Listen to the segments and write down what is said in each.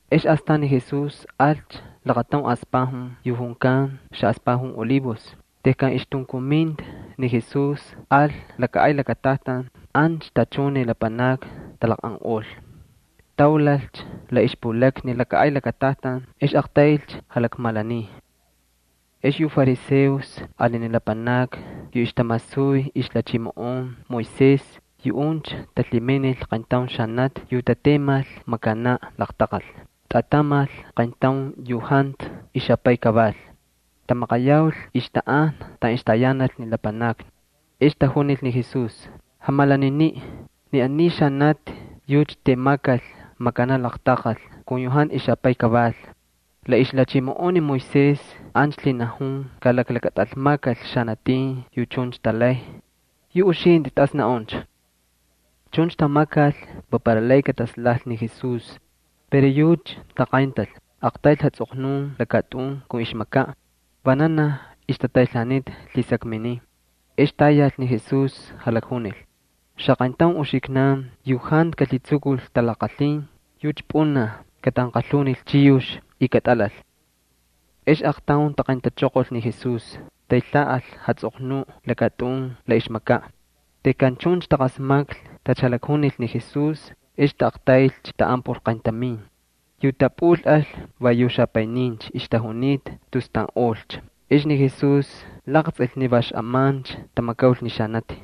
Ex astan ni Jesús alcha lakataun aspajun yu junkan Xaꞌaspajun Olivos. Tejkan ixtunkuminta ni Jesús al laka ay lakatajtan, ancha tachun ni lapanakni talaqꞌanꞌol. Taulalcha la ixpulakna ni laka ay lakatajtan ex aqtaylcha jalakmalaniy. Ex yu fariseos ali ni lapanakni yu ixtamasuy ixlhachimoꞌonkꞌan ni israelitas, yuꞌuncha talhiminil qayntaun xanati yu tatemal makanaꞌ laqtaqal, tꞌatamal qayntaun yu jantu ixapay kaval. Tamaqayaul ixtanꞌajna taꞌan ixtayanal ni lapanakni. Ex tajunil ni Jesús: —Jamalaniniꞌ, ni aniy xanati yucha temakal makanaꞌ laqtaqal kun yu jantu ixapay kaval. La ixlhachimoꞌon ni Moisés ancha lhinajun kalaklakatꞌalmakal xanatin yu chuncha talay. Yu uxintꞌi, ¿tas naꞌuncha? Chuncha tamakal va para lay katatislajmal ni Jesús. Pero yucha taqayntal, aqtayl jatsꞌoqnun lakatꞌun kun ixmakaꞌ. Vananaj ixtataylhaanita lhisakminin, ex tayal ni Jesús jalakjunil: —Xaqayntaun uxiknan yu jantu kalhitsukul talaqalhin yucha pꞌunaj katanqalhunil chiyux y katꞌalal. Ex aqtaun taqayntachoqol ni Jesús, taylhaꞌal jatsꞌoqnuꞌ lakatꞌun la ixmakaꞌ. Tejkan chuncha taqasmaklhi tacha jalakjunil ni Jesús ex taꞌaqtaylcha taꞌan por qayntamin. Yu tapꞌulꞌal va yu xapaynincha ixtajunita tus taꞌanꞌolcha. Ex ni Jesús laqtsꞌil ni va xꞌamancha tamakaul ni xanati.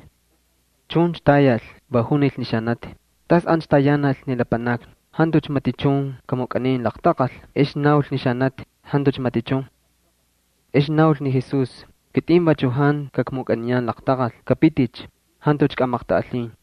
Chuncha tayal, va junil ni xanati: —¿Tas ancha tayanal ni lapanakni? ¿Jantucha matichun kamukꞌanin laqtaqal? Ex naul ni xanati: —Jantucha matichun. Ex naul ni Jesús: —Kitꞌin vachu jantu kakmukꞌaniyan laqtaqal. Kꞌapiticha. Jantucha kꞌamaqtꞌaꞌalhin.]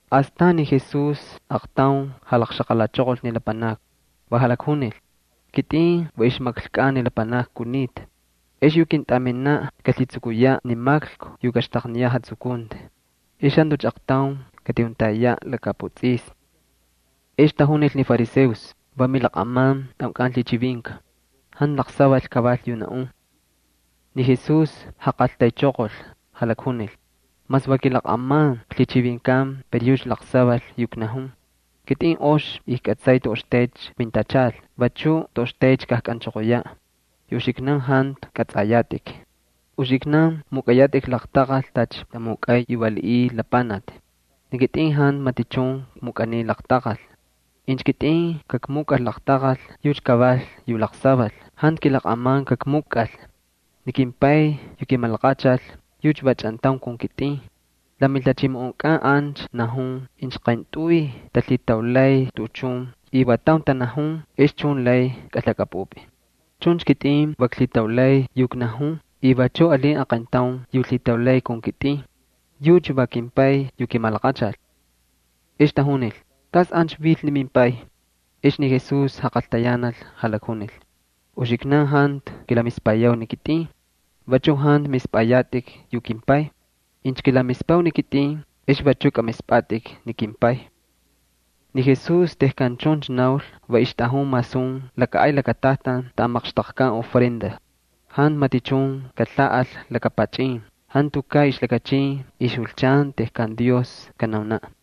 Astan ni Jesús aaqtaun jalaqxaqalachoqol ni lapanakni, va jalakjunil: —Kitꞌin va ixmaklkukꞌan ni lapanakni kunita. Ex yu kintꞌaminaꞌ kalhitsukuyaꞌ ni maklku yu kaxtaqniyaꞌ jatsukunti. Ex jantucha aqtaun katijuntayayaꞌ laka putsꞌisni. Ex tajunil ni fariseos: —Va milaqꞌaman tꞌaunkꞌan lhichivinka. Jantu laqsaval kaval yu naꞌun. Ni Jesús jaqaltaychoqol, jalakjunil: —Mas va kilaqꞌaman klhichivinkan, pero yucha laqsaval yu knajun. Kitꞌin ox ijkꞌatsay toꞌoxtaycha kmintachal, vachuꞌ toꞌoxtaycha kajkꞌanchoqoyaꞌ. Yu uxiknan jantu kꞌatsꞌayatꞌik. Uxiknan mukꞌayatꞌik laqtaqal tacha tamukꞌay yu valiꞌiy lapanakni. Ni kitꞌin jantu matichun kmukꞌaniy laqtaqal. Incha kitꞌin kakmukꞌal laqtaqal yucha kaval yu laqsaval, jantu kilaqꞌaman kakmukꞌal. Ni kimPay yu kimalaqachal, yucha va chꞌantaun kun kitꞌin. La milhachimoꞌonkꞌan ancha najun incha qayntꞌuy talhitaulay tuꞌuchun, y va taun tanajun, ex chun lay kꞌalhakꞌapꞌupꞌi. Chuncha kitꞌin va klhitaulay yu knajun y vachuꞌ alin aqayntaun yu lhitaulay kun kitꞌin. Yucha va kimPay yu kimalaqachal. Ex tajunil: —¿Tas ancha vil ni mimpay? Ex ni Jesús jaqaltayanal, jalakjunil: —Uxiknan jantu kilamispayau ni kitꞌin, vachu jantu mispꞌayatꞌik yu kimPay. Incha kilamispau ni kitꞌin ex vachu kꞌamispꞌatꞌik ni kimPay. Ni Jesús tejkan chuncha naul va ixtꞌajun masun laka ay lakatajtan taꞌan maqxtaqkan ofrenda. Jantu matichun kalhaꞌal laka pachꞌin, jantukaꞌ ixlakachin ixjulchan tejkan Dios kanaunaꞌ.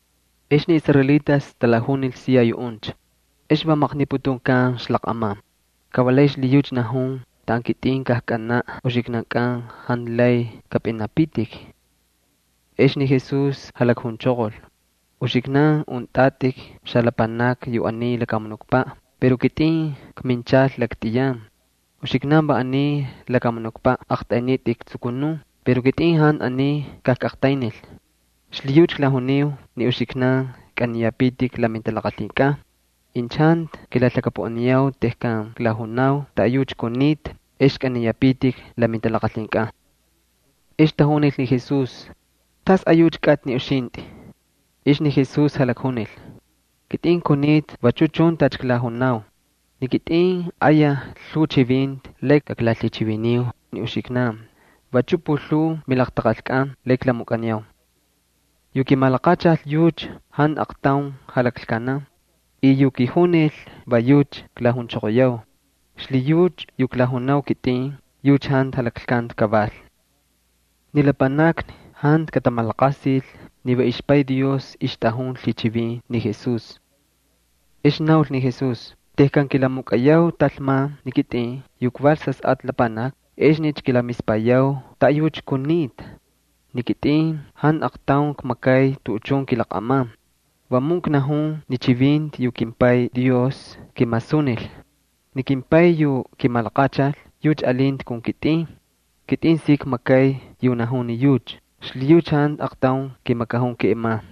Ex ni israelitas talajunil siya yuꞌuncha: —¿Ex va maqniputunkan ixlaqꞌaman? Ka va lay xlhiyucha najun: “Taꞌan kitꞌin kajkꞌanaꞌ uxiknankꞌan jantu lay kapꞌinapitik”. Ex ni Jesús jalakjunchoqol: —Uxiknan untꞌatꞌik xalapanakni yu aniy lakamunukpaꞌ, pero kitꞌin kminchal laktꞌiyan. Uxiknan va aniy lakamunukpaꞌ aqtꞌaynitꞌik tsukunun, pero kitꞌin jantu aniy kajkꞌaqtaynil. Xlhiyucha klajuniu ni uxiknan kꞌaniyapitik la mintalaqalhinkꞌan. Incha jantu kilalhakapuꞌaniyau tejkan klajunau taꞌayucha kunita ex kꞌaniyapitik la mintalaqalhinkꞌan. Ex tajunil ni Jesús: —¿Tasꞌayucha kꞌatꞌi ni uxintꞌi? Ex ni Jesús jalakjunil: —Kitꞌin kunita vachu chun tacha klajunau. Ni kitꞌin ayaj lhuu chivinti lay kaklalhichiviniu ni uxiknan vachu pulhuu milaqtaqalkꞌan lay klamukꞌaniyau. Yu kimalaqachal yucha jantu aqtaun jalaklkanan y yu kijunil va yucha klajunchoqoyau. Xlhiyucha yu klajunau kitꞌin, yucha jantu jalaklkanti kaval. Ni lapanakni jantu katamalaqasil ni va ixPay Dios ixtꞌajun lhichivin ni Jesús. Ex naul ni Jesús: —Tejkan kilamukꞌayau talman ni kitꞌin yu kval Sasꞌatꞌa Lapanaki, exnicha kilamispayau taꞌayucha kunita. Ni kitꞌin jantu aqtaun kmakay tuꞌuchun kilaqꞌaman. Vamun knajun ni chivinti yu kimPay Dios kimasunil. Ni kimPay yu kimalaqachal yucha alinta kun kitꞌin. Kitꞌin si kmakay yu lakanajun ni yucha, xlhiyucha jantu aqtaun kimakajun keꞌeman.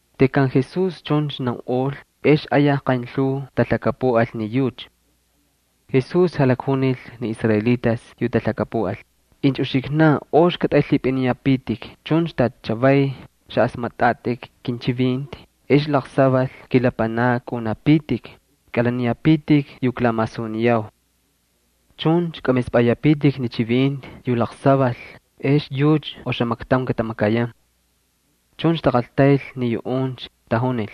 Tejkan ni Jesús chuncha naunꞌol ex ayaj qaynlhuu talhakapuꞌal ni yucha. Ni Jesús jalakjunil ni israelitas yu talhakapuꞌal: —Incha uxiknan ox katꞌaylhipꞌiniyapitik chuncha tacha chavay xaꞌasmatꞌatꞌik kinchivinti, ex laqsaval kilapanakni kaꞌunapitik, kꞌalaniyapitik yu klamasuniyau. Chuncha kꞌamispꞌayapitik ni chivinti yu laqsaval, ex yucha oxamaktaun katamakayan. Chuncha taqaltayl ni yuꞌuncha, tajunil: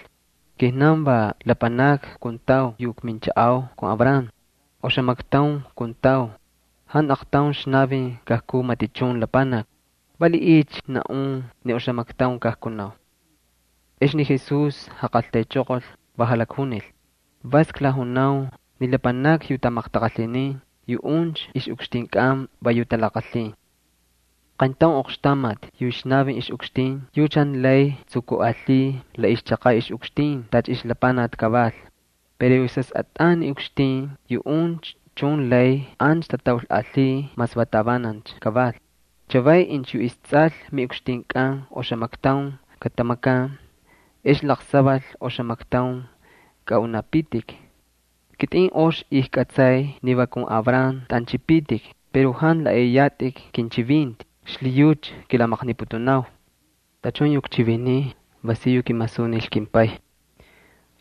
—Kijnan va lapanakni kuntau yu kminchaꞌau kun Abraham. Oxamaktaun kuntau, jantu aqtaun kaꞌalil kiꞌukxtinkꞌan. ¿Valiꞌiycha naꞌun ni oxamaktaun kajkunau? Ex ni Jesús jaqaltaychoqol, va jalakjunil: —Vas klajunau ni lapanakni yu tamaqtaqalhinin, yuꞌuncha ixꞌukxtinkꞌan va yu talaqalhin. Qayntaun oqxtamati yu ixnavin ixꞌukxtin yucha jantu lay tsukuꞌalhiy la ixchaqaꞌ ixꞌukxtin tacha ixlapanaki kaval. Pero yu sasꞌatꞌan ni ukxtin yuꞌuncha chun lay ancha tataulꞌalhiy mas va tavanancha kaval. Chavay incha yu istsꞌal miꞌukxtinkꞌan oxamaktaun katamakan ex laqsaval oxamaktaun kaꞌunapitik. Kitꞌin ox ijkꞌatsay ni va kun Abraham tꞌanchꞌipitik pero jantu laꞌaꞌiyatꞌik kinchivinti, xlhiyucha kilamaqniputunau. Tachun yu kchiviniy va si yu kimasunil kimPay.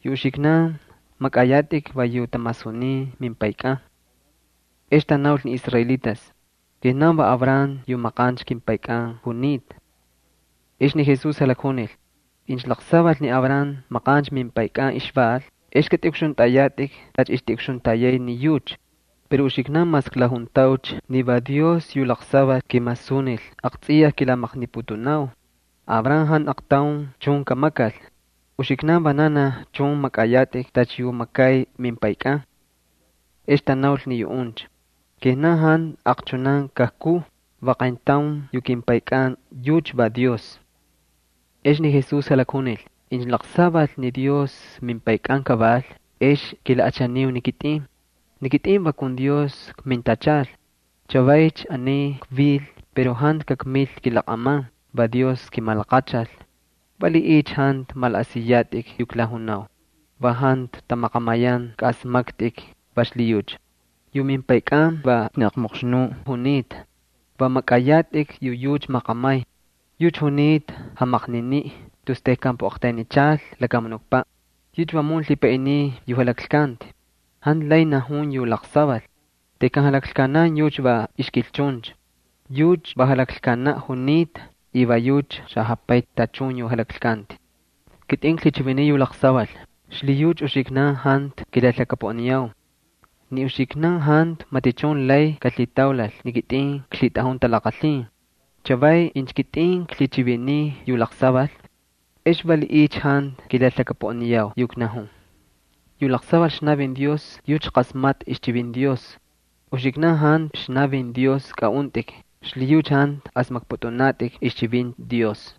Yu uxiknan makꞌayatꞌik va yu tamasunin mimpaykꞌan. Ex tanaul ni israelitas: —Kijnan va Abraham yu maqancha kimpaykꞌan junita. Ex ni Jesús jalakjunil: —Incha laqsaval ni Abraham maqancha mimpaykꞌan ixval, ex kꞌatꞌiꞌukxuntꞌayatꞌik tacha ixtiꞌukxuntayay ni yucha. Pero uxiknan mas klajuntaucha ni va Dios yu laqsaval kimasunil, aqtsꞌiyaj kilamaqniputunau. Ni Abraham jantu aqtaun chun kamakal. Uxiknan vananaj chun makꞌayatꞌik tacha yu makay mimpaykꞌan. Ex tanaul ni yuꞌuncha: —Kijnan jantu aqchunan kajkuu, va qayntaun yu kimPaykꞌan yucha va Dios. Ex ni Jesús jalakjunil: —Incha laqsaval ni Dios mimPaykꞌan kaval ex kilaꞌachaniu ni kitꞌin, ni kitꞌin va kun Dios kmintachal. Chavaycha aniy kvil pero jantu kakmil kilaqꞌaman, va Dios kimalaqachal. ¿Valiꞌiycha jantu malaꞌasiyatꞌik yu klajunau? Va jantu tamaqamayan kaꞌasmaktꞌik, va xlhiyucha. Yu mimpaykꞌan va aqmoqxnuꞌ junita, va makꞌayatꞌik yu yucha maqamay. Yucha junita jamaqniniꞌ tus tejkan puꞌaqtaynichal lakamunukpaꞌ. Yucha vamun lhipaꞌiniy yu jalaklkanti, jantu lay najun yu laqsaval. Tejkan jalaklkanan yucha va ixkilchuncha. Yucha va jalaklkanaꞌ junita y va yucha xajapay tachun yu jalaklkanti. Kitꞌin klhichiviniy yu laqsaval, xlhiyucha uxiknan jantu kilalhakapuꞌaniyau. Ni uxiknan jantu matichun lay kalhitaulal ni kitꞌin klhitꞌajun talaqalhin. Chavay incha kitꞌin klhichiviniy yu laqsaval, ¿ex valiꞌiycha jantu kilalhakapuꞌaniyau yu knajun? Yu laqsaval ixnavin Dios yucha qasmatꞌa ixchivinti Dios. Uxiknan jantu ixnavin Dios kaꞌuntꞌik, xlhiyucha jantu asmakpꞌutꞌunatꞌik ixchivinti Dios.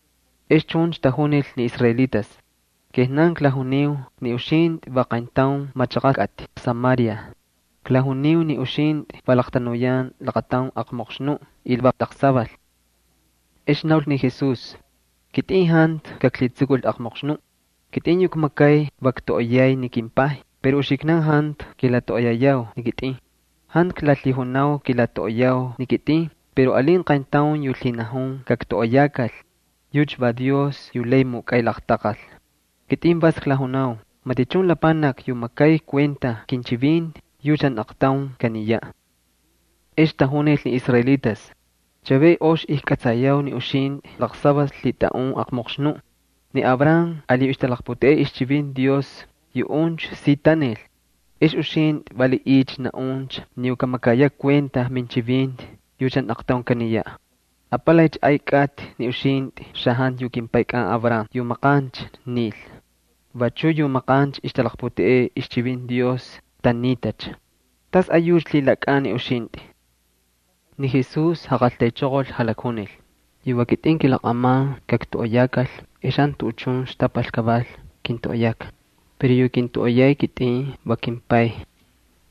Ex chuncha tajunil ni israelitas: —Kijnan klajuniu ni uxintꞌi va qayntaun machaqa kꞌatꞌi Samaria. Klajuniu ni uxintꞌi va laqtanuyan laqataun aqmoqxnuꞌ y va laqsaval. Ex naul ni Jesús: —Kitꞌin jantu kaklhitsukul aqmoqxnuꞌ. Kitꞌin yu kmakay va ktoꞌoyay ni kimPay, pero uxiknan jantu kilatoꞌoyayau ni kitꞌin. Jantu klalhijunau kilatoꞌoyau ni kitꞌin pero alin qayntaun yu lhinajun kaktoꞌoyakal. Yucha va Dios yu lay mukꞌay laqtaqal. Kitꞌin vas klajunau. Matichun lapanaki yu makay kuenta kinchivinti yucha jantu aqtaun kaniyaꞌ. Ex tajunil ni israelitas: —Chavay ox ijkꞌatsayau ni uxintꞌi laqsaval lhitꞌaꞌun aqmoqxnuꞌ. Ni Abraham ali yu ixtalaqputeꞌey ixchivinti Dios maqancha yuꞌuncha si tanil. Ex uxintꞌi, ¿valiꞌiycha naꞌuncha ni yu kamakayaꞌ kuenta minchivinti yucha jantu aqtaun kaniyaꞌ? ¿Apalaycha ay kꞌatꞌi ni uxintꞌi xajantu yu kimpaykꞌan Abraham yu maqancha nil? Vachu yu maqancha ixtalaqputeꞌey ixchivinti Dios tanitacha. ¿Tasꞌayucha lhilakꞌan ni uxintꞌi? Ni Jesús jaqaltaychoqol, jalakjunil: —Yu va kitꞌin kilaqꞌaman kaktoꞌoyakal ex jantu tuꞌuchun xtapal kaval kintoꞌoyaka. Pero yu kintoꞌoyay kitꞌin va kimPay.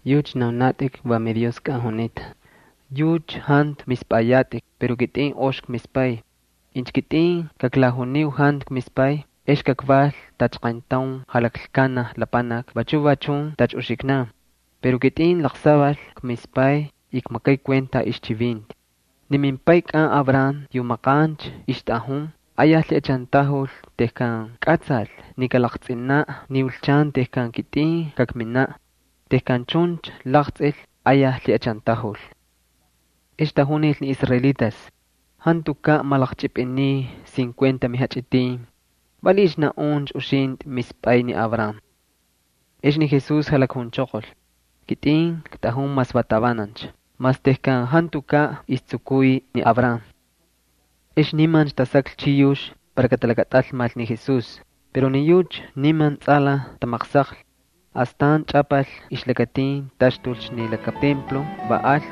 Yucha naunatꞌik va miDioskꞌan junita. Yucha jantu mispꞌayatꞌik pero kitꞌin ox kmispay. Incha kitꞌin kaklajuniu jantu kmispay ex kakval tacha qayntaun jalaklkanaj lapanaki vachu va chun tacha uxiknan. Pero kitꞌin laqsaval kmispay y kmakay kuenta ixchivinti. Ni mimpaykꞌan Abraham yu maqancha ixtꞌajun ayaj lhiꞌachantajul tejkan kꞌatsal ni kalaqtsꞌinaꞌ ni julchan tejkan kitꞌin kakminaꞌ. Tejkan chuncha laqtsꞌil ayaj lhiꞌachantajul. Ex tajunil ni israelitas: —Jantukaꞌ malaqchꞌipꞌiniy cincuenta mijachꞌitin. ¿Valiꞌiycha naꞌuncha uxintꞌi mispꞌay ni Abraham? Ex ni Jesús jalakjunchoqol: —Kitꞌin ktꞌajun mas va tavanancha, mas tejkan jantukaꞌ istsukuy ni Abraham. Ex nimancha tasaklhi chiyux para katalakatꞌalmal ni Jesús. Pero ni yucha niman tsꞌalaj tamaqsaqlhi. Astan chꞌapal ixlakatin, taxtulcha ni laka ay lakatajtan, va alcha.